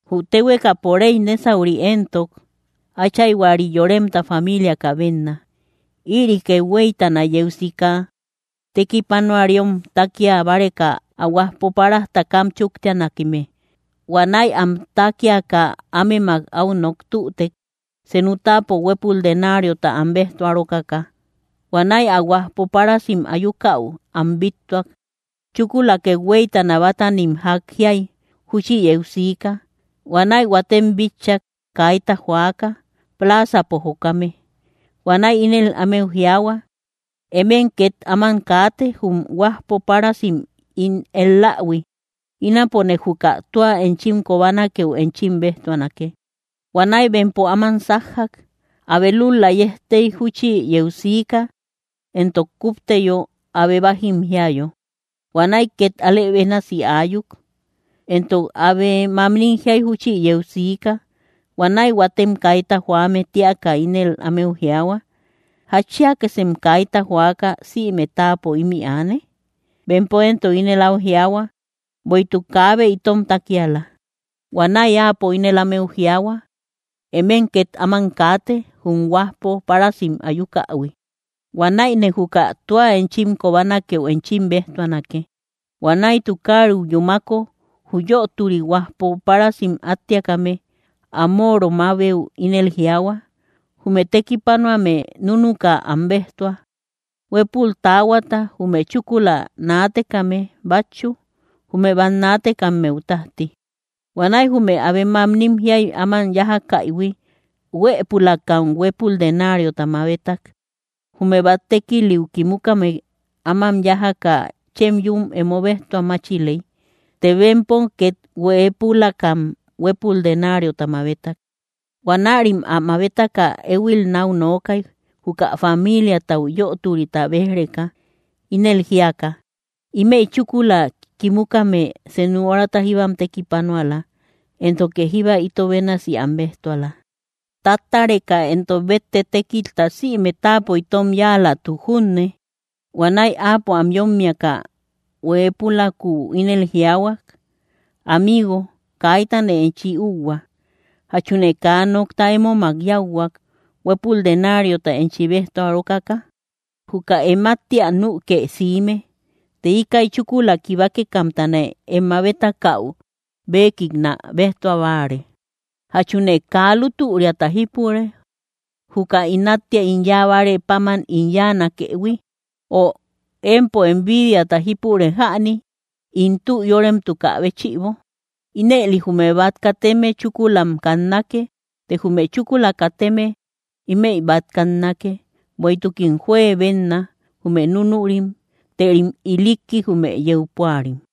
’Jü téhuekapo réy nésauri éntok áchayhuari yoremta famiiliaka bénna. Ïri kethueytana yeu siika, tekipanuariom tákia báreka, ä huajpo páras takam chúktianakeme. Huanäi am tákiaka ámemak áu nok tütek, senu táapo huépul denariota am béjtua rókaka. Huanäi ä huajpo párasim ayukäu am bíttuak. Chúkula kethueytana bátanim ják jiay júchi yeu siika. Huanäi huatem bitchak, kaita joaka, plaazapo jokame. Huanäi ínel ámeu jiaahua: “Emem ket áman kaate, jum huajpo párasim ín él‑lähui. Ínapone juka tua enchim kobanakeu enchim béjtuanake.” Huanäi bempo áman sájjak. Abe lúl‑la yejtey júchi yeu siika, entok kúpteyo abe bájim jiayo; huanäi két alë bénasi aayuk. Entok abe mamnim jiay júchi yeu siika. Huanäi huatem kaita joame téaka, ínel ámeu jiaahua: “¿Jatchiakasem kaita joaka sïme táapo ímï aane?” Bempo éntok ínel áu jiaahua: “Bueïtuk kaabe itom tákiala.” Huanäi áapo ínel ámeu jiaahua: “Emem két áman kaate, jum huajpo párasim ayukähui; huanäine juka tua enchim kobanakeu enchim béjtuanake.” Huanäi tukariu yúmako, jü yöturi huajpo párasim áttiakame, ä móoromabeu ínel jiaahua: “Jume tekipanuame núnuka am béjtua, huépul taahuata, jume chúkula naatekame bátchu, jume bát naatekammeu tájti.” Huanäi jume abe mamnim jiay áman yájakaïhui, hueepulakam huépul denariota mabetak. Jume bát tékiliu kimukame áman yájaka chem yún emo béjtua máchiley; të bempom két hueepulakam huépul denariota mabetak. Huanärim ä mabetaka éhuil náu nookay, juka famiiliatau yöturita béj‑reka, ínel jíaka: “Ímëi chúkula kimukame senu orata jíbam tekipanuala, éntoke jíba ito bénasi am béjtuala, ¡táttareka entok bétte tékilta sïme táapo itom yáalatuk junne!” Huanäi áapo am yómmiaka huepülakuu ínel jiaahuak: “Amigo, kaitane enchi úuhua. ¿Jachune kaa nokta émomak yáuhuak, huépul denariota enchi béjtua rókaka? Juka em áttia nükë siime; të íkäi chúkula kibakekamtane em mabetakäu béekiknä béjtua báare. ¿Jachune kaa lútüriata jípure, juka ín áttia ín yáa bárë páman ín yáanakëhui? Ö, ¿empo envidiata jípure jäni, ín tü yóremtukä béchïbo?” Ínëli jume bát kateme chúkulam kannake; të jume chúkula kateme, ímëi bát kannake. Bueïtukim juebenna, jume núnurim; tërim ilikki, jume yeu púarim.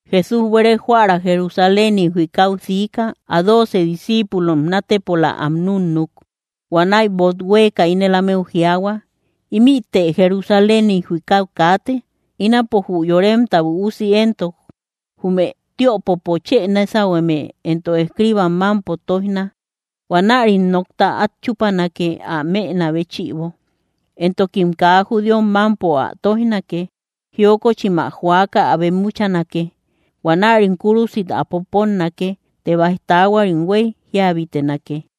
Jesús buere joära Jerusaléniu jikau sika, ä dooce discíipulom naatepola am núnnuk. Huanäi böot huéeka ínel ámeu jiaahua: —Ímïte Jerusaléniu jikau kaate. Ínapo jü Yoremta Üusi éntok jume tiöpopo chë nésahueme entok escriibam mámpo tóijna. Huanärim nokta át chúpanake, ä mënä béchïbo, entokim kaa judíom mámpo ä tóijnake. Jiokochim ä joaka ä bemmuchanake. Huanärim kúrusit ä poponnake; të báij taahuarim huéy jíabitenake.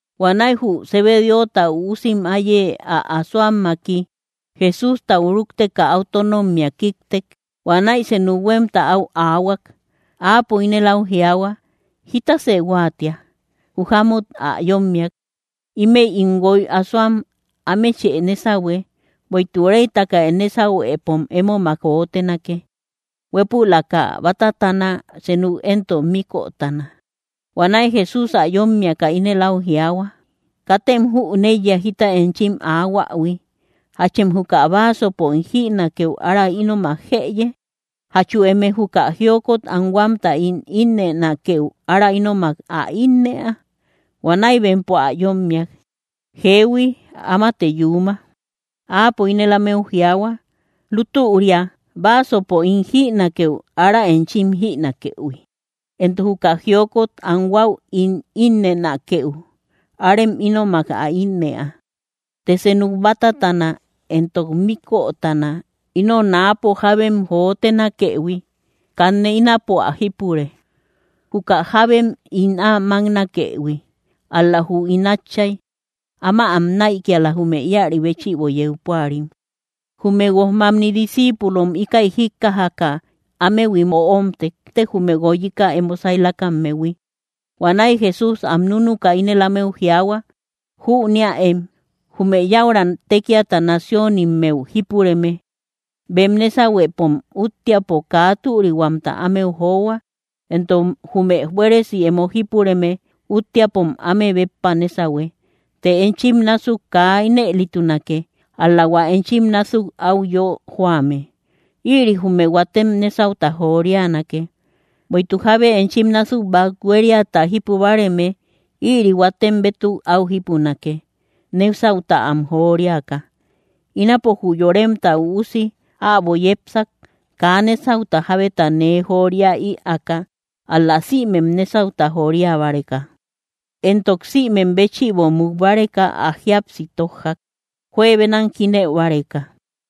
Huanäi jü Zebedeota üusim áiye ä asoammaki Jesústau rúkteka, áu tónommia kíktek. Huanäi senu huémta áu aahuak. Áapo ínel áu jiaahua: —¿Jítasë huáatia? Jü jámut ä yómmiak: —Ímëi ín guoy asoam, ámechë nésahue, bueïtuk réytaka em nésahuepom émomak jotenake, huépülaka bátatana, senuk éntok míkötana. Huanäi Jesús ä yómmiaka ínel áu jiaahua: —Katem jüneiya jita enchim aahuähui. ¿Jachem juka báasopo ín jïnakeu ára ínomak jëye? ¿Jachu emëe juka jiokot anhuamta ín innënakeu ára ínomak ä innëa? Huanäi bempo ä yómmiak: —Jeehui, ámate yuuma. Áapo ínel ámeu jiaahua: —Lútüria báasopo ín jïnakeu ára enchim jïnakëhui, entok juka jiokot anhuau ín innënakeu arem ínomak ä innëa. Të senuk bátatana entok míkötana, ino náapo jábem jotenakëhui, kanne ínapo ä jípure, juka jábem ín ä máknakëhui; ál‑la jü ín Átchay áma am näikiala, jume íäri béchïbo yeu púarim. Jume guojmamni discíipulom íkäi jíkkajaka ámehuim öomtek, jume guoyika emo sailakammehui. Huanäi Jesús am núnuka ínel ámeu jiaahua: —Jüneäem, jume yäura tékiata naciónimmeu jípureme, bem nésahuepom úttiapo kaa türihuamta ámeu johua, entok jume buéresi emo jípureme úttiapom áme béppa nésahue. Të enchim násuk kaa ínëlitunake, ál‑la hua enchim násuk áu yö joame, ïri jume huatem nésauta jorianake. Bueïtuk jábe enchim násuk bát huériata jípu báareme, ïri huatem bétuk áu jípunake, nésauta am joriaka. Ínapo jü Yoremta Üusi äbo yepsak, kaa nésauta jabeta nee jooria ïaaka, ál‑la sïmem nésauta joria báreka; entok sïmem béchïbo muk báreka ä jíapsi tójjak, juebenam jínëu báreka.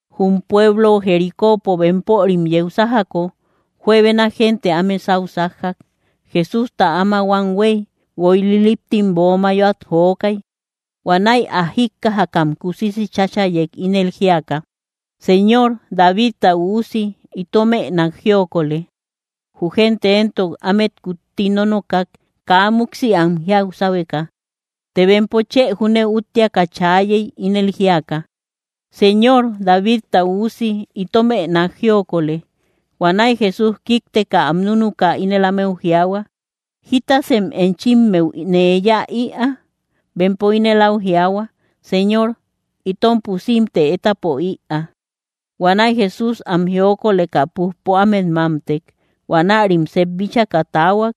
Jum pueblo Jericópo bempörim yeu sájako, juebena gente áme sáu sájjak. Jesústa áma huam huéy, guoy liliptim böo mayoat jokay. Huanäi ä jíkkajakam kusisi cháchayek, ínel jíaka: —¡Señor, Davidta Üusi, itomë nák jiokolë! Jü gente éntok ámet kutti nónokak, kaa múksi am jiau sáhueka; të bempo chë júne úttiaka chaayey, ínel jíaka: —¡Señor, Davidta Üusi, itomë nák jiokolë! Huanäi Jesús kíkteka am núnuka, ínel ámeu jiaahua: —¿Jítasem enchimmeu nee yáa ïa? Bempo ínel áu jiaahua: —Señor, itom pusimte étapo ïaa. Huanäi Jesús am jiokoleka, pújpo ámet mámtek. Huanärim sep bíchaka taahuak,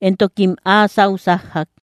entokim áa sáu sájjak.